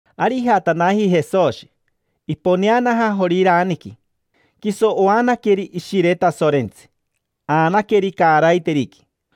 Ari ijatanaji Jesoshi, iponeanaja Joriraniqui. Quiso oanaqueri Ishire Tasorentsi, aanaqueri caaraiteriqui.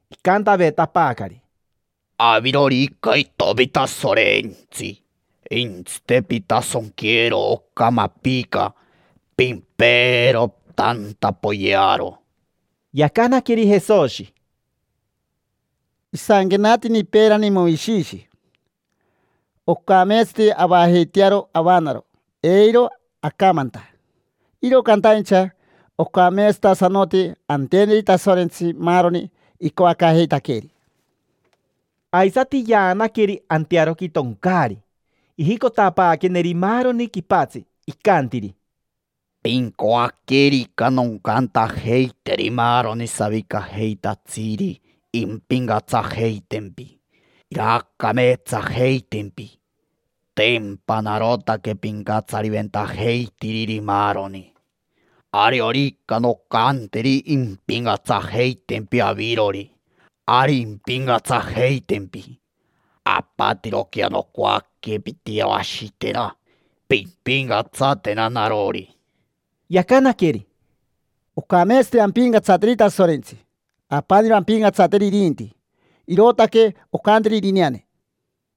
Icantavetapaacari: —Avirorica itomi Tasorentsi, jentsite: pintasonquero oca mapica, pimpeero tanta, poyearo. Yacanaqueri Jesoshi: —Isanquenatini peerani Moishishi: “Ocameetsati avajeitearo avanaro eiro acamanta, iro cantaincha ocameetsatasanoti anteneri Tasorentsi maaroni icoacaajeitaqueeri”. Aisati yaanaqueri antearoqui toncaari, ijicotapaaqueneri maaroni quipatsi, icantiri: —Pincoaquerica noncantajeiteri maaroni savicajeitatsiri impincatsajeitempi, iraacameetsajeitempi. Tempa narotaque pincatsariventajeitiriri maaroni, ariorica noncanteri impincatsajeitempi avirori, ari impincatsajeitempi. Apatiroquea nocoaque pintiyeroashitena, pimpincatsatena narori. Yacanaqueri: —Ocameetsati ampincatsateri Tasorentsi, apaniro ampincatsateri irinti. Irootaque ocantiri irineane.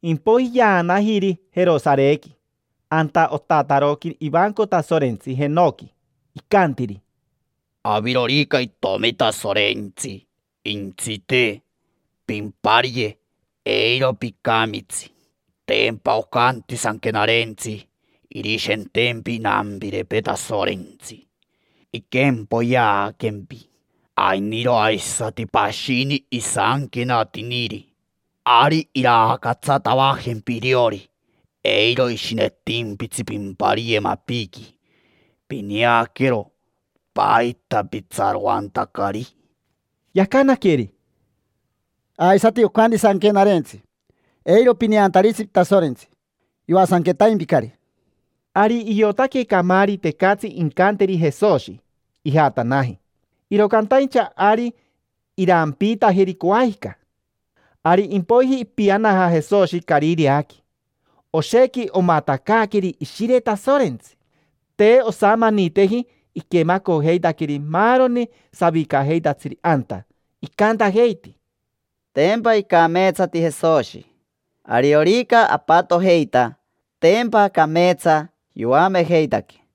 Impoiji yaanajiri Jerosarequi, anta otataroqui ivanco Tasorentsi, antoo jenoqui. Icantiri: —Avirorica itomi Tasorentsi, jentsite: pimpariye, eiro picamitsi. Tempa ocanti Sanquenarentsi: “Irishentempi inampirepee Tasorentsi, inquempoyeaquempi”. Ainiro aisati pashini isanquenatiniri: “Ari irancatsatavajempi iriori, eiro ishinetimpitsi pimpariye mapiqui”. Pineaquero, ¿paita pitsaroantacari? Yacanaqueri: —Aisati ocanti Sanquenarentsi: “Eiro pineantaritsi Tasorentsi: yoasanquetaimpicari”. Ari iotaque camaari tecatsi incanteri Jesoshi, ijatanaji. Iro cantaincha ari irampiitajeri coajica. Ari impoiji ipianaja Jesoshi Carireaqui, oshequi omatacaaqueri Ishire Tasorentsi. Te osamaniteji iquemacojeitaqueri maaroni savicajeitatsiri anta. Icantajeiti: —Tempa icameetsati Jesoshi; ariorica apatojeita, tempa cameetsa yoamejeitaquee.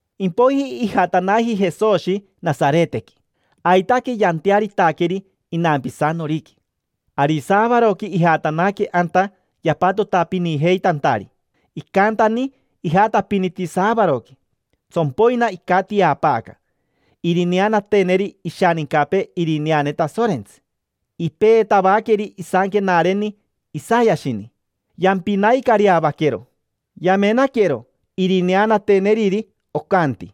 Impoiji ijatanaji Jesoshi Nasaretequi, aitaque yantearitaqueri inampisanoriqui. Ari saavaroqui ijatanaque anta yapatotapinijeitantari, icantani ijatapiniti saavaroqui. Tsompoina icatiapaaca, irineanateneri ishanincapee irineane Tasorentsi. Ipeetavaqueri isanquenareni Isayashini. Yampinaicareavaquero, yamenaquero irineanateneriri. Ocanti: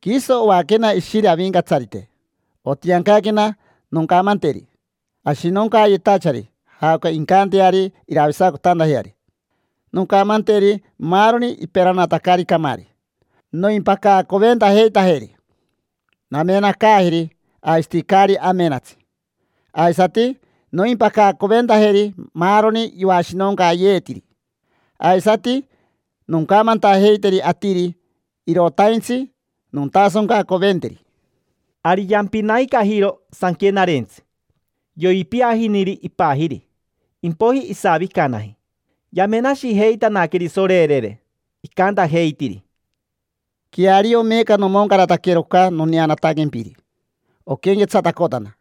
“Quiso oaquena Ishire Avincatsarite, otiancaquena noncamanteri ashinoncaayetachari jaoca incanteari iroavisacotantajeari. Noncamanteri maaroni iperanatacari camaari noimpacacoventajeitajeri. Namenacaajeri aisati caari amenatsi. Aisati noimpacacoventajeri maaroni yoashinonqueeyetiri. Aisati noncamantajeiteri atiri irotaintsi nontasoncacoventeri”. Ari yampinaicajiro sanquenarentsi, yoipiajiniri ipajiri, impoiji isavicanaji. Yamenashejeitanaqueri, sorerere. Icantajeitiri: —Queario meeca nomoncarataquero oca noneanataquempiri, oquenquetsatacotana.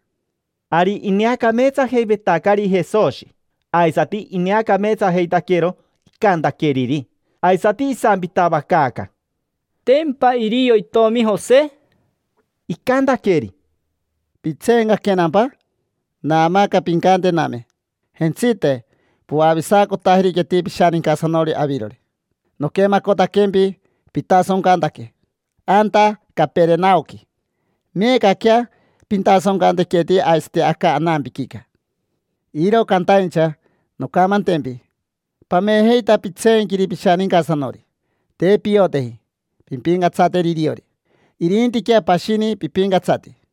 Ari ineacameetsajeivetacari Jesoshi, aisati ineacameetsajeitaquero icantaqueriri. Aisati isampitavacaaca: —¿Tempa irio itomi Jose? Icantaqueri: —¿Pitseencaquenampa? Naamaaca pincantename: “Jentsite, poavisacotajeriqueti pishanincasanori avirori. Noquemacotaquempi pitasoncantaque anta Caperenaoqui, meecaquea pintasoncantequeti aisati aca anampiquica”. Iro cantaincha noncamantempi pamejeita pitseenquiri pishanincasanori: te pioteji pimpincatsateri iriori, irintiquea pashini pipincatsati.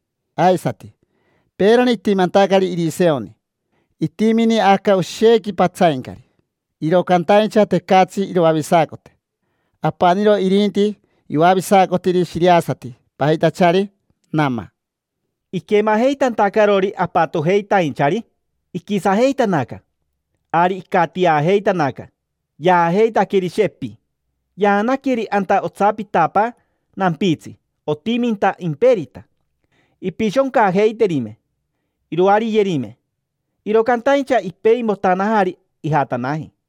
Aisati, peerani itimantacari Iriseoni, itimini aca oshequi patsaincari, iro cantaincha tecatsi iroavisacote. Apaniro irinti yoavisacotiri shiriasati pajitachari Nama. Iquemajeitantacarori apatojeitainchari, iquisajeitanaca. Ari icatiajeitanaca, yaajeitaqueri, shepi. Yaanaqueri anta otsapitapaa nampitsi, otiminta imperita. Impishoncajeiterime, iroariyerime, iro cantaincha ipeimotanajari, ijatanaji.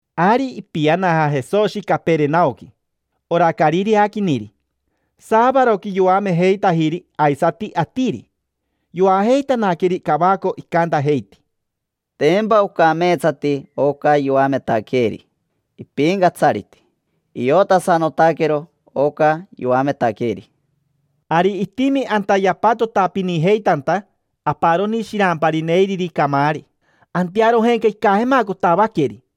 Ari ipianaja Jesoshi Caperenaoqui, ora carireaquiniri. Saavaroqui yoamejeitajiri aisati atiri. Yoajeitanaqueri cavaco, icantajeiti: —Tempa ocameetsati oca yoametaqueeri. Ipincatsariti: iotasanotaquero oca yoametaqueeri. Ari itimi anta yapatotapinijeitanta aparoni shirampari neiriri camaari. Antearojenca icajemacotavaqueri: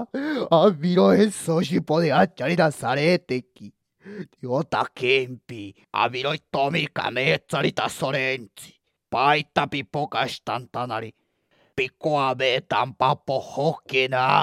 —Aviro Jesoshi poneachari Nasaretequi. Niotaquempi: aviro itomi cameetsari Tasorentsi. ¿Paita pipocashitantanari? ¿Picoavetampa pojoquena?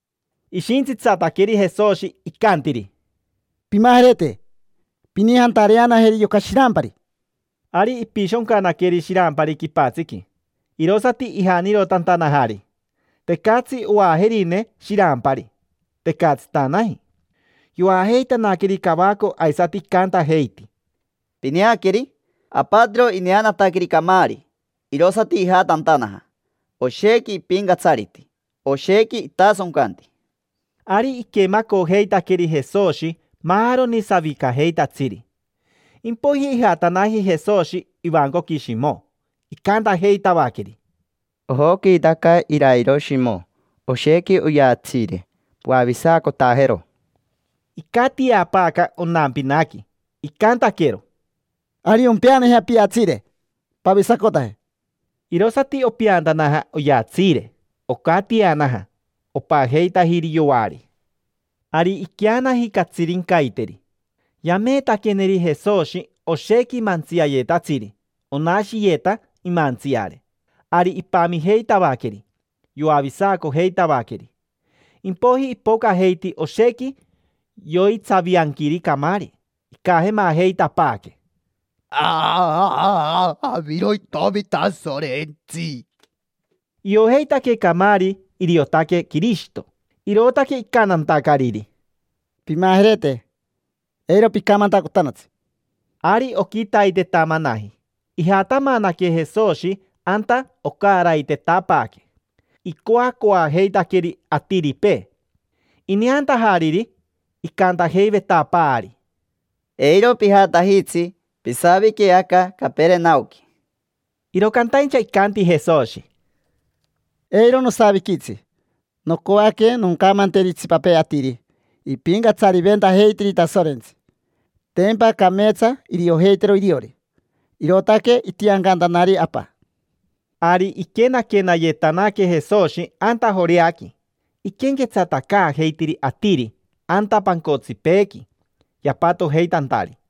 Ishintsitsataqueri Jesoshi, icantiri: —Pimajerete. Pinijantareanajeri yoca shirampari. Ari ipishoncanaqueri shirampari quipatsiqui, tiricn, irosati ijanirotantanajari. Tecatsi oajerine shirampari, tecatsitanaji. Yoajeitanaqueri cavaco aisati icantajeiti: —Pineaqueri: apatiro ineanataqueri camaari, irosati ijatantanaja. Oshequi ipincatsariti, oshequi itasoncanti. Ari iquemacojeitaqueri Jesoshi maaroni savicajeitatsiri. Impoiji ijatanaji Jesoshi ivancoqui Shimo. Icantajeitavaqueri: —Ojoquiitaca irairo Shimo, oshequi oyatsiire. Poavisacotajero. Icatiapaaca onampinaqui, icantaquero: —Ari ompeanajea piatsiire, pavisacotaje. Irosati opeantanaja oyatsiire, maani; ocatianaja, opajeitajiri yoari. Ari iqueanaji catsirincaiteri. Yameetaqueneri Jesoshi oshequi mantsiayetatsiri, onashiyeta imantsiare. Ari ipamijeitavaqueri, yoavisacojeitavaqueri. Impoiji ipocajeiti oshequi yoitsavianquiri camaari, icajemajeitapaaque: —Aviro itomi Tasorentsi. Iojeitaque camaari iriotaque Quirishito, irootaque icantantacariri: —Pimajerete, eiro picamantacotanatsi. Ari oquitaitetamanaji ijatamanaque Jesoshi anta ocaraitetapaaque. Icoacoajeitaqueri atiripee. Ineantajariri, icantajeivetapaari: —Eiro pijatajitsi, pisavique aca Caperenaoqui. Iro cantaincha icanti Jesoshi: —Eiro nosaviquitsi. Nocoaque noncamanteri itsipapee atiri ipincatsariventajeitiri Tasorentsi, tempa cameetsa iriojeitero iriori. Irootaque itiancantanari Apa. Ari iquenaquenayetanaque Jesoshi anta Joreaqui, iquenquetsatacaajeitiri atiri anta pancotsipeequi yapatojeitantari.